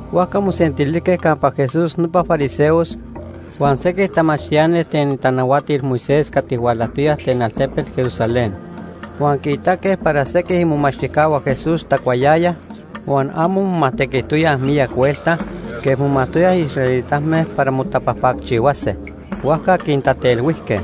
Huajca mosentilijque campa Jesús nopa fariseos huan sequij tamachtiani ten itanahuatil Moisés cati hualajtoyaj ten altepet Jerusalén. Huan quiitaque para sequij imomachtijcahua Jesús tacuayayaj huan amo momajtequijtoyaj miyac huelta quej momajtoyaj israelitame para motapajpacchihuase, huajca quintatelhuijque.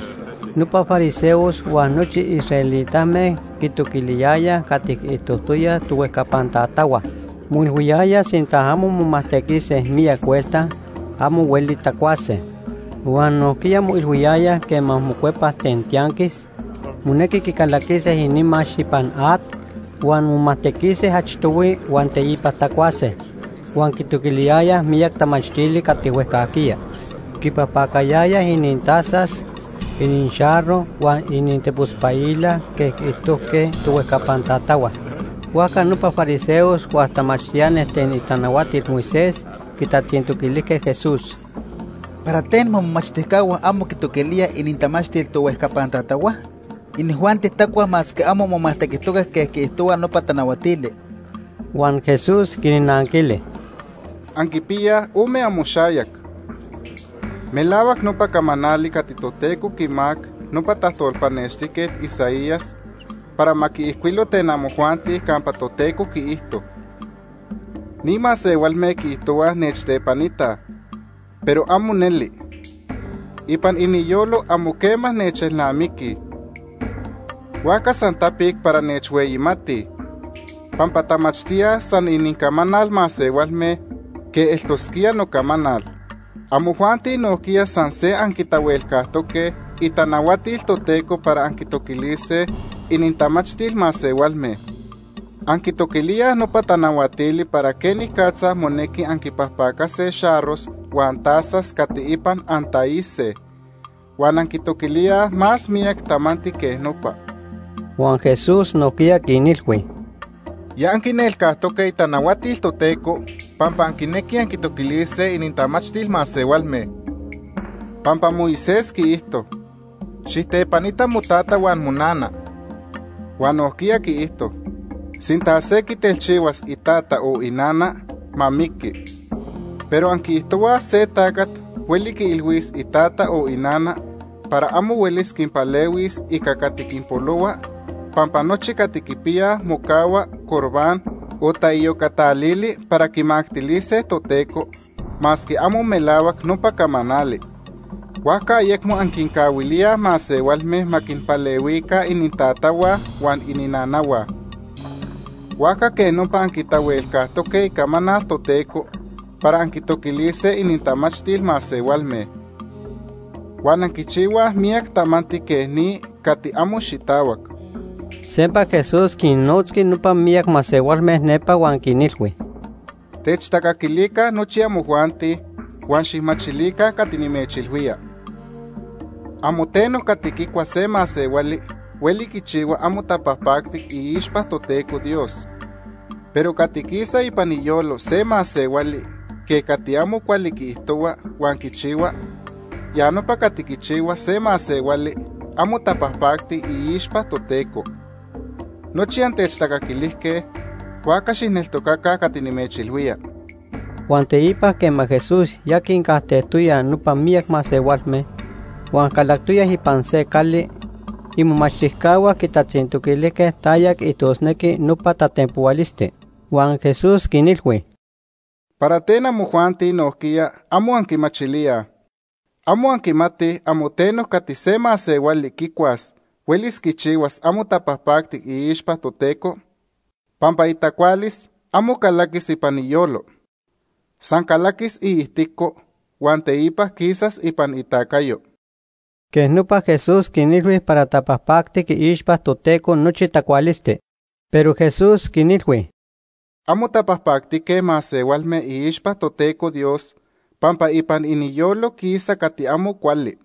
Nopa fariseos huan nochi israelitame quitoquiliyayaj cati quiijtojtoyaj tohuejcapan tatahua. Moilhuiyayaj sinta amo momajtequise miyac huelta, amo hueli tacuase. Huan nojquiya moilhuiyayaj quema mocuepaj ten tianquis, monequi quicalaquise inimax ipan at huan momajtequise achtohui huan teipa tacuase. Huan quitoquiliyayaj miyac tamachtili cati huejcajquiya. Quipajpacayayaj inintazas, inixarro huan inintepospaila quej quiijtojque tohuejcapan tatahua. Huajca nopa fariseos huan tamachtiani ten itanahuatil Moisés quitatzintoquilijque Jesús: ―¿Para ten momomachtijcahua amo quitoquilíaj inintamachtil tohuejcapan tatahua? Inijuanti tacuaj masque amo momajtequijtoque quej quiijtohua nopa tanahuatili. Huan Jesús quinnanquili: ―¡Anquipiyaj ome amoxayac! Melahuac nopa camanali cati Toteco quimacac nopa tajtolpanextijquet Isaías para ma quiijcuilo ten amojuanti campa Toteco quiijto: ‘Ni masehualme quiijtohuaj nechtepanitaj, pero amo neli. Ipan iniyolo amo quema nechelnamiquij. Huajca san tapic para nechhueyimatij, pampa tamachtíaj san inincamanal masehualme quej eltosquía nocamanal.’ Amojuanti nojquiya san se anquitahuelcajtoque itanahuatil Toteco para anquitoquilise inintamachtil masehualme. Anquitoquilíaj nopa tanahuatili para quenicatza monequi anquipajpacase xarros huan tazas cati ipan antaise, huan anquitoquilíaj más miyac tamanti quej nopa. Huan Jesús nojquiya quinilhui: ―Ya anquinelcajtoque itanahuatil Toteco pampa anquinequij anquitoquilise inintamachtil masehualme. Pampa Moisés quiijto: ‘Xijtepanita motata huan monana’, huan nojquiya quiijto: ‘Sinta se quitelchihuas itata o inana, ma miqui.’ Pero anquiijtohuaj se tacat hueli quiilhuis itata o inana para amo huelis quinpalehuis ica cati quinpolohua pampa nochi cati quipiyaj mocahua Corbán o taiyocatalili para quimactilise Toteco, masque amo melahuac nopa camanali. Huajca ayecmo anquincahuilíaj masehualme ma quinpalehuica inintatahua huan ininanahua. Huajca quej nopa anquitahuelcajtoque icamanal Toteco para anquitoquilise inintamachtil masehualme. Huan anquichihuaj miyac tamanti quej ni cati amo xitahuac. Sempa Jesús quinnotzqui nopa miyac masehualme nepa huan quinilhui: ―Techtacaquilica nochi amojuanti, huan xijmachilica cati nimechilhuía. Amo teno cati quicua se masehuali hueli quichihua amo tapajpactic iixpa Toteco Dios. Pero cati quisa ipan iyolo se masehuali quej cati amo cuali quiijtohua huan quichihua, ya nopa cati quichihua se masehuali amo tapajpacti iixpa Toteco. Nochi antechtacaquilijque, huajca xijneltocaca cati nimechilhuía. Huan teipa quema Jesús ya quincajtejtoya nopa miyac masehualme huan calactoya ipan se cali, imomachtijcahua quitatzintoquilijque taya quiijtosnequi nopa tatenpohualisti. Huan Jesús quinilhui: ―¿Para ten amojuanti nojquiya amo anquimachilíaj? ¿Amo anquimatij amo teno cati se masehuali quicuas huelis quichihuas amo tapajpactic iixpa Toteco? Pampa itacualis amo calaquis ipan iyolo. San calaquis iijtico huan teipa quisas ipan itacayo. Quej nopa Jesús quinilhui para tapajpactic iixpa Toteco nochi tacualisti. Pero Jesús quinilhui: ―Amo tapajpactique masehualme iixpa Toteco Dios pampa ipan iniyolo quisa cati amo cuali.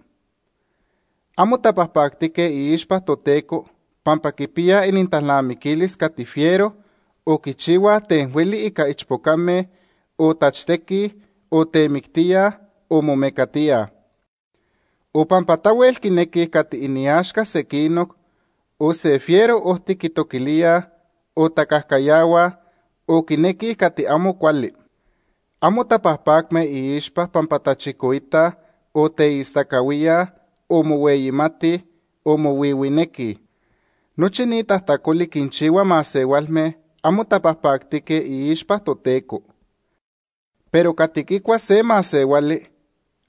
Amo tapajpactique iixpa Toteco pampa quipiyaj inintalnamiquilis cati fiero, o quichihuaj ten hueli ica ichpocame, o tachtequij, o temictíaj, o momecatíaj. O pampa tahuel quinequij cati iniaxca sequinoc, o se fiero ojti quitoquilíaj, o tacajcayahuaj, o quinequij cati amo cuali. Amo tapajpacme iixpa pampa tachicoitaj, o teistacahuíaj, o mohueyimatij, o mohuihuinequij. Nochi ni tajtacoli quinchihua masehualme amo tapajpactique iixpa Toteco. Pero cati quicua se masehuali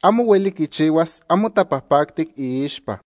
amo hueli quichihuas amo tapajpactic iixpa.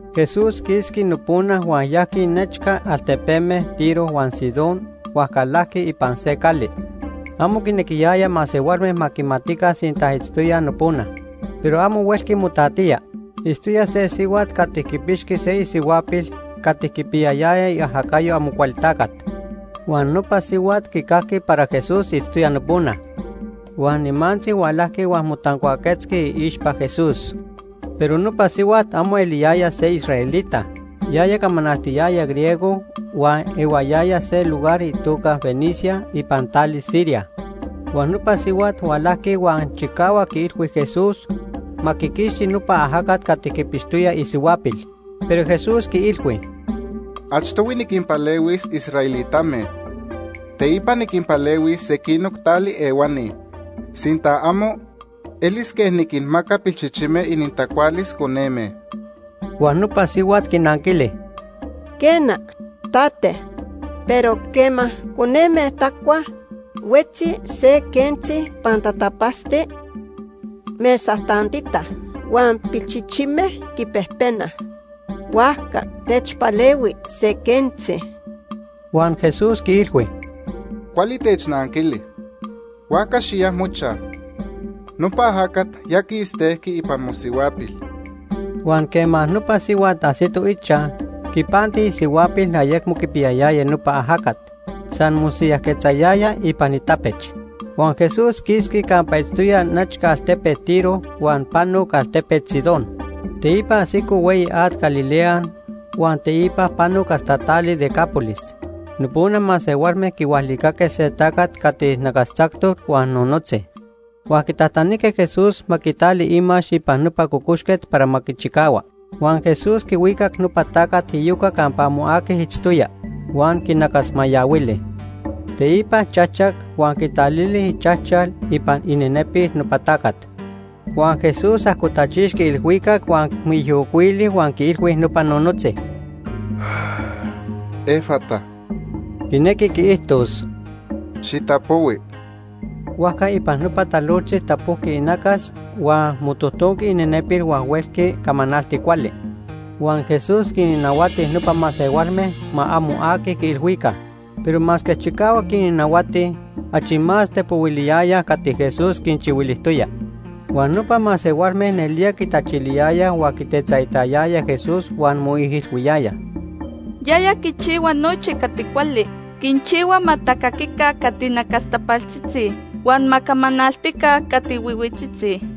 Jesús quisqui nopona huan yajqui nechca altepeme Tiro huan Sidón huan calajqui ipan se cali. Amo quinequiyaya masehualme ma quimatica sinta itztoya nopona, pero amo huelqui motatía. Itztoya se sihuat cati quipixqui se isihuapil cati quipiyayaya iajacayo Amocualtacat. Huan nopa sihuat quicajqui para Jesús itztoya nopona. Huan nimantzi hualajqui huan motancuaquetzqui iixpa Jesús. Pero nopa sihuat amo eliyaya se israelita. Yaya camanaltiyaya griego huan ehuayaya se lugar itoca Fenicia ipan tali Siria. Huan nopa sihuat hualajqui huan chicahuac quiilhui Jesús ma quiquixti nopa ajacat cati quipixtoya isihuapil. Pero Jesús quiilhui: ―Achtohui niquinpalehuis israelitame. Teipa niquinpalehuis sequinoc tali ehuani. Sinta amo, elis quej niquinmaca pilchichime inintacualis coneme. Huan nopa sihuat quinanquili: ―Quena, tate, pero quema coneme tacuaj, huetzi se quentzi pantatapatzti mesa tantita huan pilchichime quipejpenaj. Huajca techpalehui se quentzi. Huan Jesús quiilhui: ―Cuali technanquili, huajca xiya mochaj; nopa ajacat ya quistejqui ipan mosihuapil. Huan quema nopa sihuat ajsito ichaj, quipanti isihuapil ayecmo quipiyayaya nopa ajacat, san mosiyajquetzayaya ipan itapech. Huan Jesús quisqui campa itztoya nechca altepet Tiro huan panoc altepet Sidón. Teipa ajsico hueyi at Galilea huan teipa panoc hasta tali Decápolis. Nopona masehualme quihualicaque se tacat cati nacastzactoc huan nonotzi, huan quitajtanijque Jesús ma quitali imax ipan nopa cocoxquet para ma quichicahua. Huan Jesús quihuicac nopa tacat iyoca campa amo aqui itztoya, huan quinacasmayahuili. Teipa chajchac huan quitalili ichajchal ipan inenepil nopa tacat. Huan Jesús ajcotachixqui ilhuicac huan moijiyocuili huan quiilhui nopa nonotzi: “¡Efata!” (quinequi quiijtos: “¡Xitapohui!”) Huajca ipan nopa talojtzi tapojqui inacas huan motojtonqui inenepil huan huelqui camanalti cuali. Huan Jesús quinnahuati nopa masehualme ma amo aqui quiilhuica. Pero masque chicahuac quinnahuati, achi más tepohuiliyayaj cati Jesús quinchihuilijtoya. Huan nopa masehualme nelía quitachiliyayaj huan quitetzaitayayaj Jesús huan moijilhuiyayaj: “Yaya quichihua nochi cati cuali. Quinchihua ma tacaquica cati nacastapaltzitzi huan ma camanaltica cati nonotzitzi.”